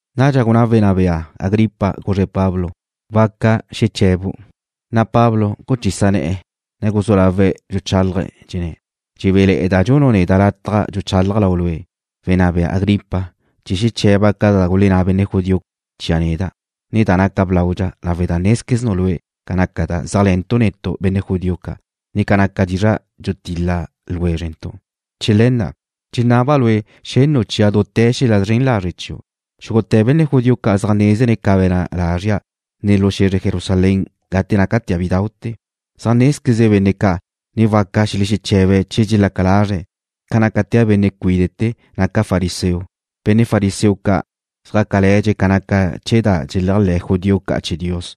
Nadxa gunná wenná bea Agripa, guzre̱' Pablo: ―Waca xeche̱bu'. Na' Pablo guchisa ne̱'e̱, ne guzú lawe̱' dxuchálaje̱', dxenné̱': ―Dxebéle̱'e̱da' dxunu' neda' lataj dxuchálaja' lau lue', wenná bea Agripa, chee̱ xeche̱ba' ca da gulenná benne' judío chia' neda', ne da naca blaudxa, lawe' da nézqueznu' lue' ca naca da zéajle̱ntu' netu', benne' judío ca', ne ca naca dizra' dxutil-la ljwézrentu'. Chee̱ le̱ na' dxenaba' lue' xennu' chia' dute̱ xel-la' zren lazre' chiu'. ’Xúgute̱ benne' judío ca' zaj nézene̱' ca be̱na' lazria', ne lu xe̱zre Jerusalén gate nácatea' bidau'te̱. Zaj nézqueze benne' ca', ne waca xelexeche̱be̱' che dxelaca lazre̱', ca nácatea' benne' cuíde'te̱, naca' fariseo. Benne' fariseo ca' zjácale̱dxe̱' ca naca chee̱ da dxeléajle̱ judío ca' chee̱ Dios.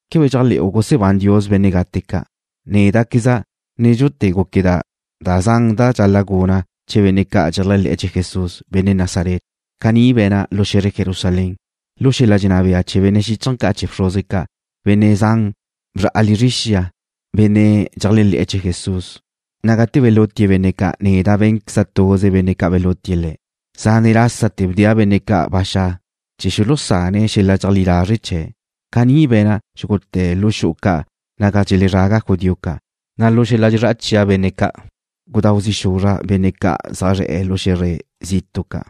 ¿Quebe dxéajle̱'u gusebán Dios benne' gate ca'? ’Néda'queza' nédxute̱ gúqueda' da zan da dxal-la' guna' chee̱ benne' ca' dxeléajle̱'e̱ chee̱ Jesús, benne' Nazaret. Caní be̱na' lu xe̱zre Jerusalén. Lu xel-la' dxenná bea chee̱ benne' xíchaje̱ ca' chee̱ bxruze ca', benne' zan bzra'a lizre xia, benne' dxeléajle̱'e̱ chee̱ Jesús, na' gate belútie̱' benne' ca' neda' bé̱nqueza' tuze benne' ca' belútie̱' le̱'. Zane' lásate̱ bdea' benne' ca' ba xa' chee̱ xulusane̱' xel-la' dxeleajlí lazre' chee̱'. Caní be̱na' xúgute̱ lu xu'u ca' naga dxelezraga judío ca', na' lu xel-la' dxezrá'a chia' benne' ca', gudáu zi' xuzra' benne' ca' zaj zre̱'e̱ lu xe̱zre zitu' ca'.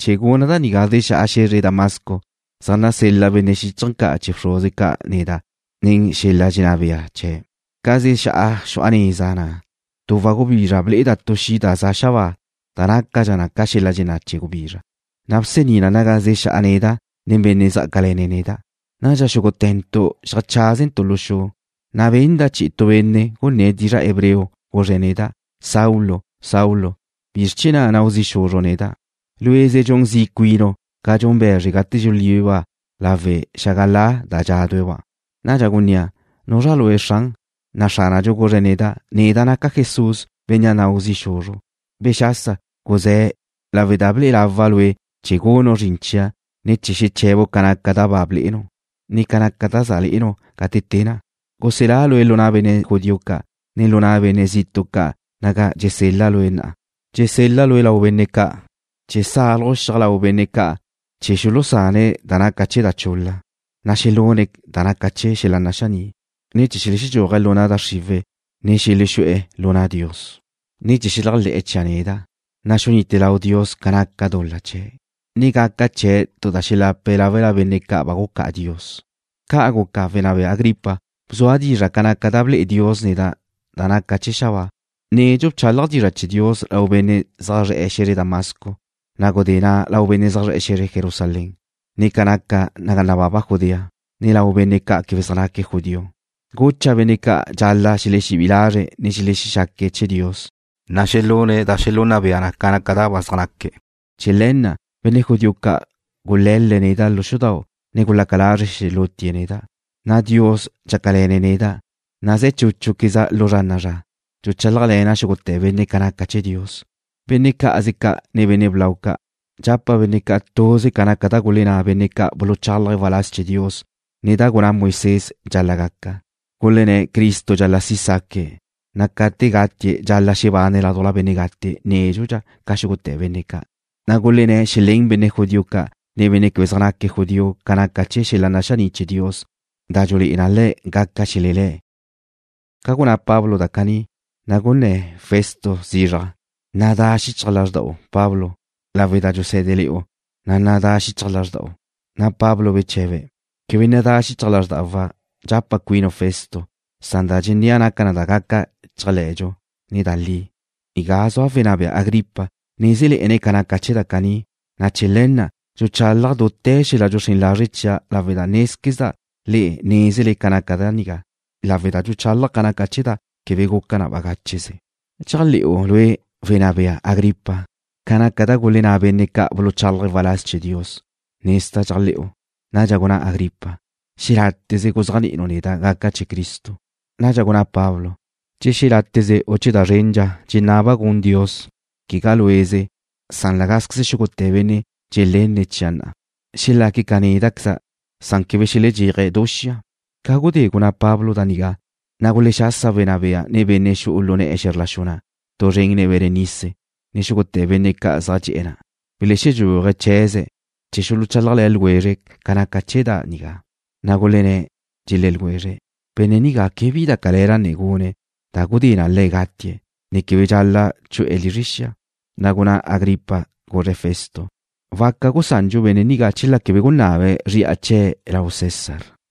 ’Chee̱ guna' da nigá zexá'a xe̱zre Damasco, zaj nasel-la benne' xíchaje̱ ca' chee̱ bxruze ca' neda' nen xel-la' dxenná bea chee̱'. Ca zexá'a xu'a neza na', du wagubizra ble'eda' tu xi' da za' xabáa da nácadxa ca xel-la' dxenná' chee̱ gubizra, na' gusení na naga zexá'a neda' nen benne' zjácale̱ne̱' neda'. Nadxa xúgute̱ntu' xeajcházentu' lu xu, na' benda' chi'i tu benne' gunné̱' dizra' hebreo, guzre̱' neda': “Saulo, Saulo, ¿bizr chee̱ na' nau zi' xuzru' neda'? Lue'ze dxun zi' cuinu' ca dxun be̱zre gate dxulíbeba' lawe' xágala da dxádue̱'-ba'.” Nadxa gunnéa': ¿Nuzra Lue', Xran? na' Xránadxu guzre̱' neda': “Neda' naca' Jesús, bénnea' nau zi' xuzru'. Bexasa, guzé̱, lawe' da ble'e lawa' lue' chee̱ gunu' zrin chia', ne chee̱ xeche̱bu' ca naca da ba blé'enu', ne ca naca da za le'enu' gate te na'a. Guselá' lue' lu na' benne' judío ca', ne lu na' benne' zitu' ca' naga dxusel-la' lue' na'a. Dxusel-la' lue' lau benne' ca' chee̱ sálaju' xiaj lau benne' ca' chee̱ xulusane̱' da naca chee̱ da chul-la, na' xelune̱' da naca chee̱ xel-la' naxaní', ne chee̱ xelexedxúaje̱' lu na' da xriwe̱', ne xelexú'e̱ lu na' Dios, ne chee̱ xeléajle̱'e̱ chia' neda', na' xunite lau Dios ca naca dul-la chee̱', ne gaca chee̱' tu da xelape̱' láwela benne' ca' ba gucá'a Dios.” ’Ca' guca, wenná bea Agripa. Bzua' dizra' ca naca da ble'e Dios neda' da naca chee̱ xabáa. Nedxu bchálaja' dizra' chee̱ Dios lau benne' zaj zre̱'e̱ xe̱zre Damasco, na' gudé na' lau benne' zaj zre̱'e̱ Jerusalén, ne ca naca naga nababa Judea, ne lau benne' ca' quebe zaj naque̱' judío. Gucha' benne' ca' dxal-la' xelexebí'i lazre̱', ne xelexexaque̱' chee̱ Dios, na' xelune̱' da xelunna bea na ca da ba zaj naque̱'. Chee̱ le̱ na' benne' judío ca' gule̱l-le̱' neda' lu xudau', ne gulaca lazre̱' xelútie̱' neda'. Dios dxácale̱ne̱' neda', na' ze̱ chúchuqueza' lu zra na'a zra, dxuchálajle̱na' xúgute̱ benne' ca naca chee̱ Dios, benne' cá'aze ca', ne benne' blau ca'. Dxapa' benne' ca' tuze ca naca da gulenná benne' ca' buluchálaje̱' waláz chee̱ Dios, ne da gunná Moisés dxal-la' gaca. Gulenné̱' Cristo dxal-la' si' saque̱', na' ca te gatie̱' dxal-la' xebane̱' ládujla benne' gate nédxudxa ca xúgute̱ benne' ca', na' gulenné̱' xelén benne' judío ca', ne benne' quebe zaj naque̱' judío ca naca chee̱ xel-la' naxaní' chee̱ Dios, da dxulé'e na le̱' ca gaca xelelé̱'. Gate gunná Pablo da caní, na' gunná zizraj Festo: ―Nadá xichaj lázrda'u, Pablo. Lawe' da dxusé̱dele̱'u, na' nadá xichaj lázrda'u. Pablo beche̱be̱': ―Quebe nadá xichaj lázrdawa', dxapa' cuinu' Festo. Da dxennéa' naca na da gaca chéajle̱dxu, ne da li. Nigá zua wenná bea Agripa. Nézele̱'e̱ne̱' ca naca chee̱ da caní, na' chee̱ le̱ na' dxuchálaja' dute̱ xel-la' dxuxrén lazre' chia' lawe̱'. Nézquezda' le̱' nézene̱' ca naca da nigá lawe' da dxuchálaja' ca naca chee̱ da quebe guca na bagácheze. ¿Dxéajle̱'u lue', wenná bea Agripa, ca naca da gulenná benne' ca' buluchálaje̱' waláz chee̱ Dios? Nezda' dxéajle̱'u. Nadxa gunná Agripa: ―Xeláteze guzéajni'inu' neda' gaca' chee̱ Cristo. Nadxa gunná Pablo: ―Che xeláteze u che da zrendxa dxenaba' gun Dios, quegá lue'ze, san cá'anqueze xúgute̱ benne' dxelenne̱' chia' na'a, xelaque̱' ca néda'queza', san quebe xeledxéaje̱' du xia. Ca gudé gunná Pablo da nigá, na' gulexasa wenná bea, ne benne' xu'u lu ne̱'e̱ xe̱zr la xu na' tu zren nen Berenice, ne xúgute̱ benne' ca' zaj dxe'e̱ na'. Belexedxúaje̱' chee̱ze̱' chee̱ xuluchálajle̱ ljwezre̱' ca naca chee̱ da nigá. Na' gulenné̱', dxelé̱ ljwezre̱': ―Benne' nigá quebe bi da cale̱la ne gune̱' da gudé na le̱' gatie̱', ne quebe dxal-la' chu'e̱ lizre xia. Na' gunná Agripa, guzre̱' Festo: ―Waca gusandxu benne' nigá chela quebe gunabe̱' zri'a chee̱' lau César.